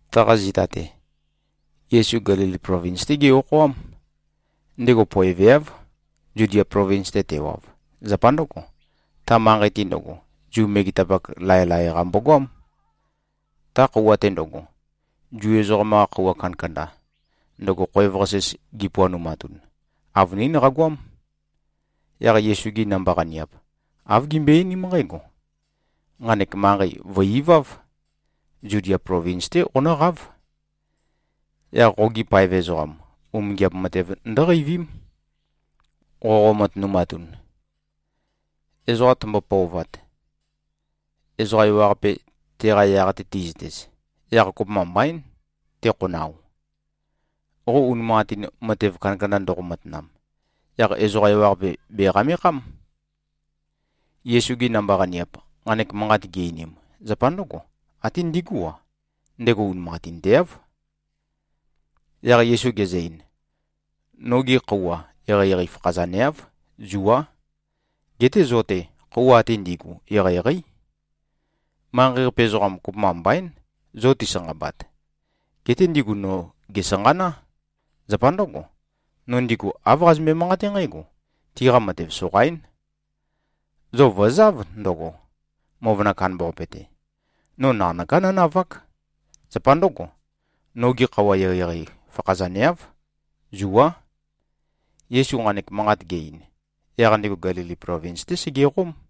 Taqa zita-te, Yesu Gelili plovins-té ge-okhoám. Ndego poeveáv, Zudia plovins-te tewav. Zapa ndǿgo, ta manqei-te ndøgo, Zu megetapak, laelae-qa mbogoám. Ta khøuwa-te ndøgo, Zu ezoqam-qa khøuwa kandakanda, ndøgo khoev-qasis gipuanumatun, avønín qagoám. Yaq Yesu-gi namba-qaniap, āv gimbøe-einím nqǽgo, “Nqanek manqei vø̀-iváv. Zudia plovins-té qonǿqáv. Yaq qogi paev ezoqam, umingiap matev ndǿqeivím, qoqo-matønumatun. Ezoqa tømbo-pøovat, ezoqa ewaqape teqa yaq-te ti꞉zøtez, yaq kopømba mbaín, tekhonao. Qo unimanqatin, matev kandakanda ndoqo-matanam, yaq ezoqa ewaqape bèqamekhám.” Yesu-gi namba-qaniap, nqanek manqat gi-einim, zapa ndǿgo. Até ndigú-a, ndego unimanqatinteáv. Yaq Yesu gezø-ein, “Nogi khøuwa eqeieqei fakhazaneáv. Zuá. Geté zo-te, khøuwa ate ndi꞉gu, eqeieqeí. Manqei-qape ezoqam, kopømba mbaín, zo tisanqabat. Geté ndigu no, gèsanqaná. Zapa ndǿgo, no ndigu āv qazømbe-manqaté nqǽgo: Tiqa matev soqaín. Zo vø̀záv ndøgo, møvøna kandambaqape-te. No naqanøká nónavák. Zapa ndǿgo, nogi khøuwa eqeieqei fakhazaneáv. Zuá.” Yesu nqanek manqat ge-ein, yaq ndego Gelili plovins-té segeqóm.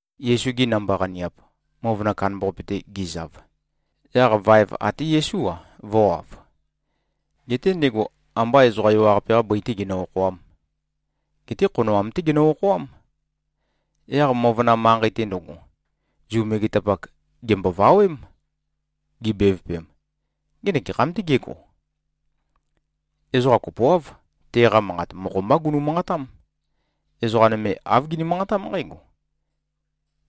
Yesu-gi namba-qaniap, møvøna kandambaqape-te gi꞉zav, yaq vaev até Yesú-a, vø̄wav. Geté ndego ambá ezoqa ewaqape-qā bøi-tē genø-okhoām, geté khonoam-té genø-okhoám. Yaq møvøna manqei-te ndøgo, Zu megetapak gèmbovawém. Gibevøpem, “Ngenek gekham-tē gégo?” Ezoqa kopoáv, teqa manqat mokho-mbá gunu-manqatám. Ezoqa nøme āv gini-manqatám nqǽgo,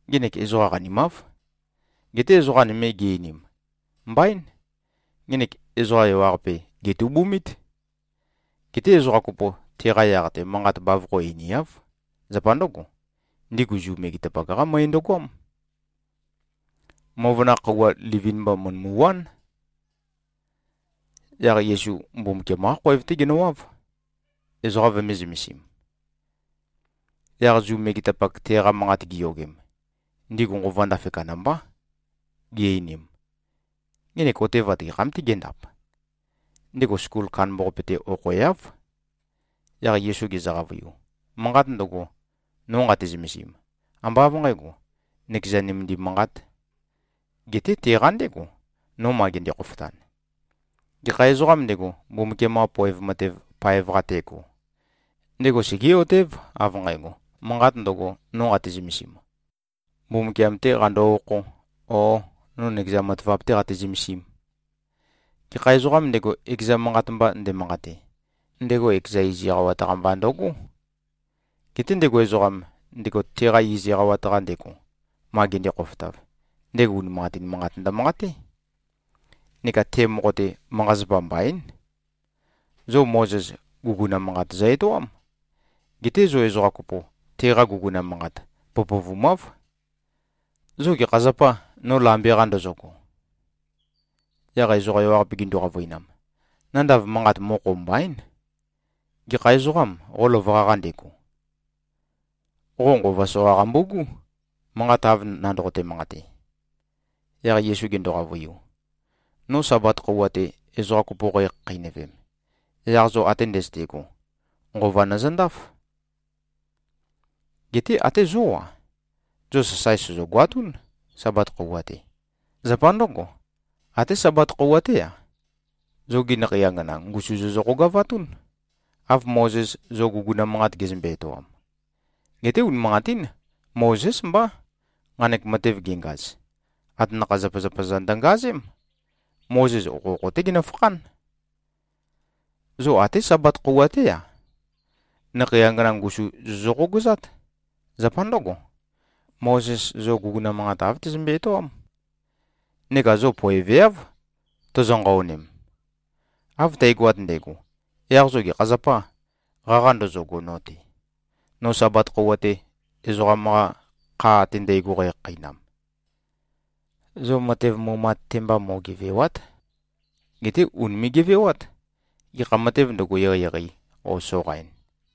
“Ngenek ezoqa qanimáv.” Geté ezoqa nøme gi-einim, “Mbaín. Ngenek ezoqa ewaqape gètubumít.” Geté ezoqa kopo, teqa yaq-te manqat bavokho einiáv. Zapa ndǿgo, ndigu Zu megetapak-qá møe ndøgoám. Møvøna khøuwa livin-mba mø̀ndømuwán. Yaq Yesu Mbumbukiam-qá khoev-té genøwáv, ezoqa vømē-zømesim. Yaq Zu megetapak teqa manqat giyogem, ndigu nqova ndafe kandambá. Gi-einim, “Ngenek otevat gekham-tē géndap? Ndego skul kandambaqape-te okhoeáv.” Yaq Yesu gezø-qavøiu, “Manqat ndøgo, no nqate-zømesim, ambá av nqǣgo, nøkeza nømendim manqāt. Geté teqa ndégo, no ma gende-khofotan. Gekha ezoqām ndego, Mbumbukiam-qa poev matev paev-qa tego, ndego segé꞉-otév, av nqægo, manqat ndøgo, no nqate-zømesim, Mbumbukiam-tē qando-okhō, ō, no nøkeza matavap-tē qate-zømesīm. Gekha ezoqām ndego, ekeza manqat mba ndemanqate, ndego ekeza iz eqawat-qa mba ndǿgo. Geté ndego ezoqam, ndego teqa iz eqawat-qa ndego, ma gende-khofotav, ndego unimanqatin manqat ndømanqaté. Neka te mokho-te, manqa-zapa mbaín. Zo Mozes, guguna manqat zø-etoám. Geté zo ezoqa kopo, teqa guguna manqat pøpøvumáv. Zo gekha zapâ, no lambe-qa ndozogo?” Yaq ezoqa ewaqape gindu-qavøinam, “Nandav manqat, mokho mbaín. Gekha ezoqâm, qo løvøqa-qa ndego? Qo nqova soqa qambu꞉gú, manqat av nandoqote-manqate.” Yaq Yesu gendo-qavøiu, “No Sabat khøuwa-te, ezoqa kopo qækhakheinøvem, yaq zo ate ndøzøte꞉go, nqova nøzøndáf. Geté até zó-a, zo sasae sozogoatún, Sabat khøuwa-te. Zapa ndǿgo, até Sabat khøuwa-té-a, zogi nakhei angana ngusu zozø-qogavatún, av Mozes zo guguna manqat gezømbe-etoam. (Geté unimanqatín. Mozés mbá, nqanek matev gengaz. Atanakha-zapazapa-za ndøngazém. Mozes okhokho-té genøfakhán.) Zo até Sabat khøuwa-té-a, nakhei angana ngusu zozø-qogøzát. Zapa ndǿgo, Mozes zo guguna manqat, āv tezømbe-etoám. Neka zo poeveáv, tozo-nqaonem. Av tægoat ndægo, yaq zo gekha zapâ, qaqa ndozogo no-te, no Sabat khøuwa-te, ezoqam-qa kha ate ndægo qækhakheinam. Zo matev mumat-te mba mo꞉gevèwa᷄t. Geté ùnime꞉-gevewát, gekha matēv ndøgo, eqeieqei o soqain.”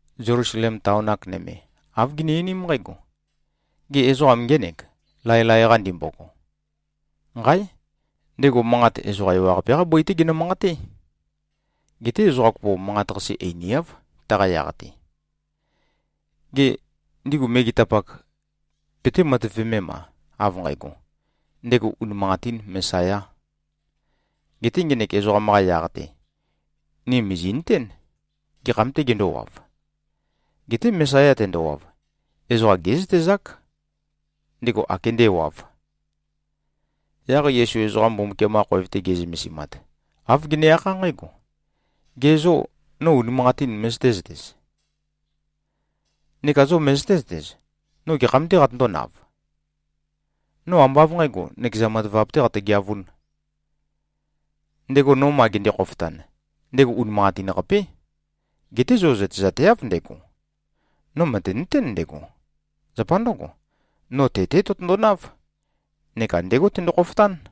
Zelusalem taon-ak nøme, āv gini-einím nqǽgo, “Gê, ezoqam ngénèk, laelae-qa ndimbogo?” Nqáe! Ndego manqat ezoqa ewaqape-qá bøi-té genø-manqaté. Geté ezoqa kopo, manqat-qase einiáv, taqa yaq-te. Gê, ndigu megetapak, peté-matøvemem-a, av nqægo, ndego unimanqatīn Mesayā? Geté ngenek ezoqam-qa yaq-te, ni mìzi꞉nøtén, gekham-tē gendówav. Geté Mesaya tendowav, ezoqa gézøtezák, ndego ākendēwav. Yaq Yesu ezoqa Mbumbukiam-qa khoev-te ge꞉zømesimat, āv gene-akhá nqǽgo, “Ge zô, no unimanqatīn møzøté-zøtez? Neka zo møzøté-zøtez, no gekham-tē qatøndónav? No ambá av nqǣgo, nøkeza matavap-tē qatøgeavūn. Ndego, no ma gende-khofotan, ndego unimanqatin-qapé. Geté zo zøtezateáv ndego. No mø̀tenøtén ndego. Zapa ndǿgo, no te-té tøtøndonáv neka ndégo tendo-khofotán.”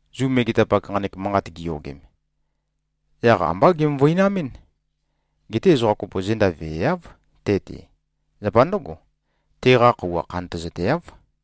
Zu megetapak, nqanek manqat giyogem, yaq ambá gemøvøinamɨ́n. Geté ezoqa kopo zenda veeáv te-te. Zapa ndǿgo, teqa khøuwa khantøzateáv.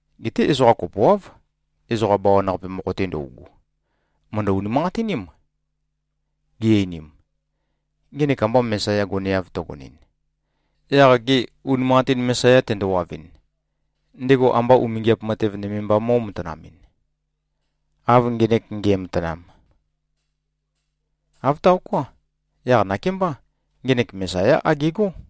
Geté ezoqa kopoáv, ezoqa bawan-qape mokho-te ndøugu, mø̀ndø-unimanqatiním. Gi-einim, “Ngenek amba Mesaya goneav tøgonɨn. Yaq gê, unimanqatin Mesaya tendowavɨn, ndego amba umingiap matev nøme mba mó꞉matanamɨn, av ngenek nge꞉matanam? Āv taoká. Yaq nakémbá, ngenek Mesayá agegó.”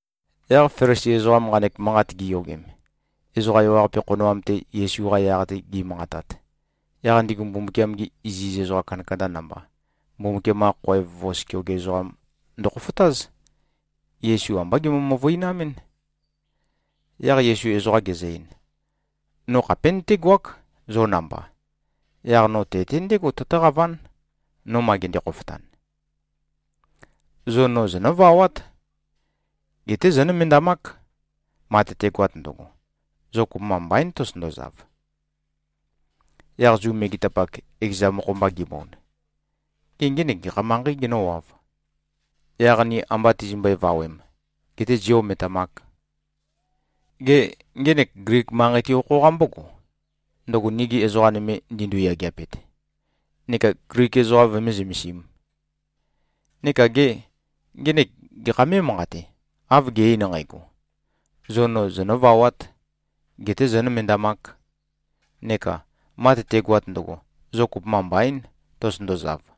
Yaq Felisi ezoqam nqanek manqat giyogem, ezoqa ewaqape khonoam-te Yesu-qa yaq-te gi꞉manqatat, yaq ndigu Mbumbukiam-gi iziz ezoqa kandakanda namba, Mbumbukiam-qa khoev vos keoge ezoqam ndøkhofotáz. Yesu ambá gemøvøinamɨ́n. Yaq Yesu ezoqa gezø-ein, “No khapé nøtégoák, zo namba. Yaq no te-te ndégo tøtǿqaván, no ma gende-khofotan. Zo no zonǿvawát. Geté zónømendamák. Ma tøtegoat ndøgo, zo kopømba mbaín, tozotøndozav.” Yaq Zu megetapak, ekeza mokho-mba gibond, “Gê, ngenek gekha manqeī genǿwāv, yaq ni amba tizimbøe-vawēm, getē zī-ometamāk? Gê, ngenek Glik manqei-te okho-qa mbógo, ndøgo nigi ezoqa nøme ndindu-yageapet, neka Glik ezoqa vømé-zømesīm? Neka gê, ngenek gekhā mé꞉manqate, av ge-ein nqægo, ‘Zo no zonø̄vawāt, getē zōnømendamāk,’ neka, ‘Ma tøtegoat ndøgo, zo kopømba mbaīn, tozotøndozav.’?”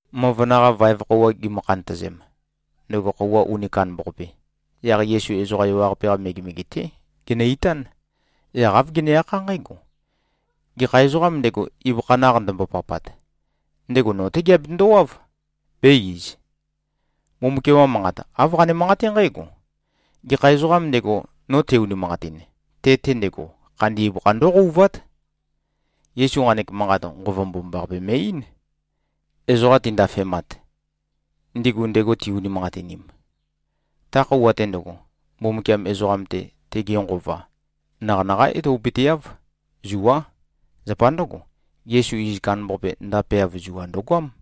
Møvøna-qa vaev khøuwa gimø-khantøzem, ndøgo khøuwa uni kandambaqape, yaq Yesu ezoqa ewaqape-qa megemege-té genø-itán. Yaq āv gene-akhá nqǽgo, “Gekha ezoqām ndego, ibøkha naq ndømbopapat, ndego no-té geabetøndo-wáv, bē-iz. Mbumbukiam-qa Manqat, āv qane-manqaté nqǽgo, ‘Gekha ezoqām ndego, no te-unimanqatin, te-te ndego, khandi ibøkha ndóqouvát.’” Yesu nqanek manqat, Nqova Mbomambaqape me꞉-eín, ezoqa tindafemat, ndigu ndego ti-unimanqatinim. Ta khøuwa-te ndøgo, Mbumbukiam ezoqam-te, tege Nqova naqanaqá etopøteáv. Zuá. Zapa ndǿgo, Yesu iz kandambaqape ndapeav zua ndøgoám.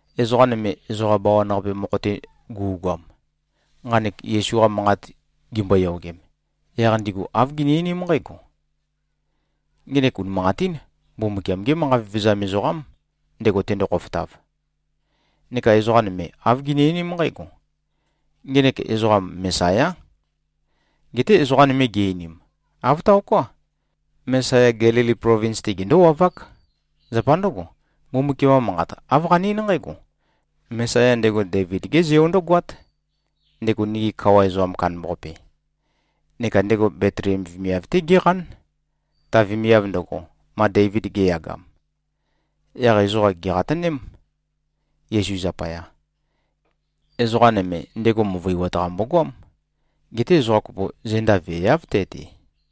Ezoqa nøme, ezoqa bawan-qape mokho-te gu꞉goam, nqanek Yesu-qa manqat gimboyogem, yaq ndigu āv gini-einím nqǽgo, “Ngenek unimanqatín Mbumbukiam-gé manqa vevezam ezoqám, ndego tendo-khofotav!” Neka ezoqa nøme, āv gini-einím nqǽgo, “Ngenek ezoqam, Mesayá!” Geté ezoqa nøme gi-einim, “Āv taoká. Mesaya Gelili plovins-te gendówavák. Zapa ndǿgo, Mbumbukiam-qa manqat āv qane-eín nqǽgo, ‘Mesaya ndego Deivid-gé Zeo ndǿgoát, ndego nigi kawa ezoqam kandambaqape. Neka ndego Betliem vemiav-té géqán, ta vemiav ndøgo, ma Deivid ge꞉yagam.’” Yaq ezoqa gèqatøném, Yesu zapaya. Ezoqa nøme, ndego møvøiwat-qa mbogoám. Geté ezoqa kopo, zenda veeáv te-te.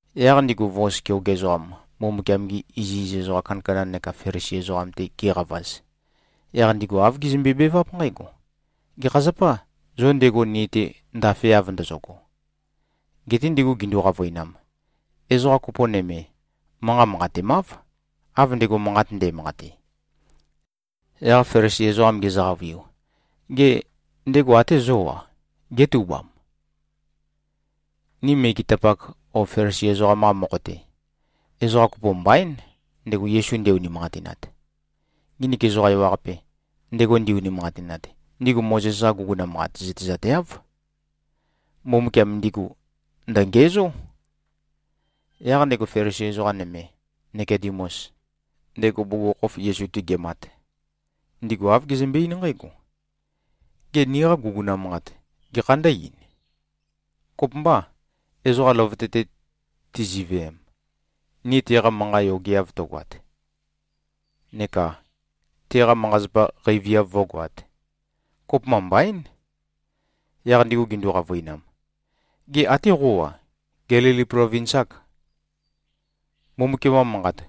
Yaq ndigu vos keoge ezoqam, Mbumbukiam-gi iziz ezoqa kandakanda neka Felisi ezoqam-te giqavaz, yaq ndigu āv gizømbe-beváp nqǽgo, “Gekha zapâ, zo ndego ni-te ndafeav ndozogo?” Geté ndigu gindu-qavøinam, “Ezoqa kopo nøme, manqat manqatemáv, av ndego manqat nde꞉manqate.” Yaq Felisi ezoqam gezø-qavøiu, “Gê, ndego até zó-a, gétubam? Ni megetapak o Felisi ezoqam-qa mokho-te, ezoqa kopo mbaín, ndego Yesu nde-unimanqatinat. Nginik ezoqa ewaqape, ndego ndi-unimanqatinat, ndigu Mozes-qa guguna manqat zøtezateáv. Mbumbukiam ndigu ndø̀ngiæzó.” Yaq ndego Felisi ezoqa nøme, Nikodemus, ndego bugukhokhof Yesu-te gemat, ndigu āv gezømbe-eín nqǽgo, “Gê, niqa guguna manqat gekhā ndǿ-ein? Kopømbâ, ezoqa løvøte-te tiziveem, ni teqa manqa yogeav tøgoat neka teqa manqa-zapa qeiviav vǿgoāt? Kopømba mbaín.” Yaq ndigu gindu-qavøinam, “Gê, até qó-a, Gelili plovins-âk? Mbumbukiam-qa Manqat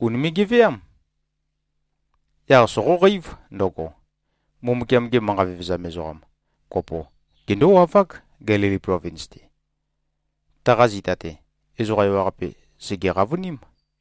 ùnime꞉-geveám. Yaq soqóqeív ndøgo, Mbumbukiam-ge manqa vevezam ezoqa kopo gendówavák, Gelili plovins-te.” Taqa zita-te, ezoqa ewaqape sège-qavøním.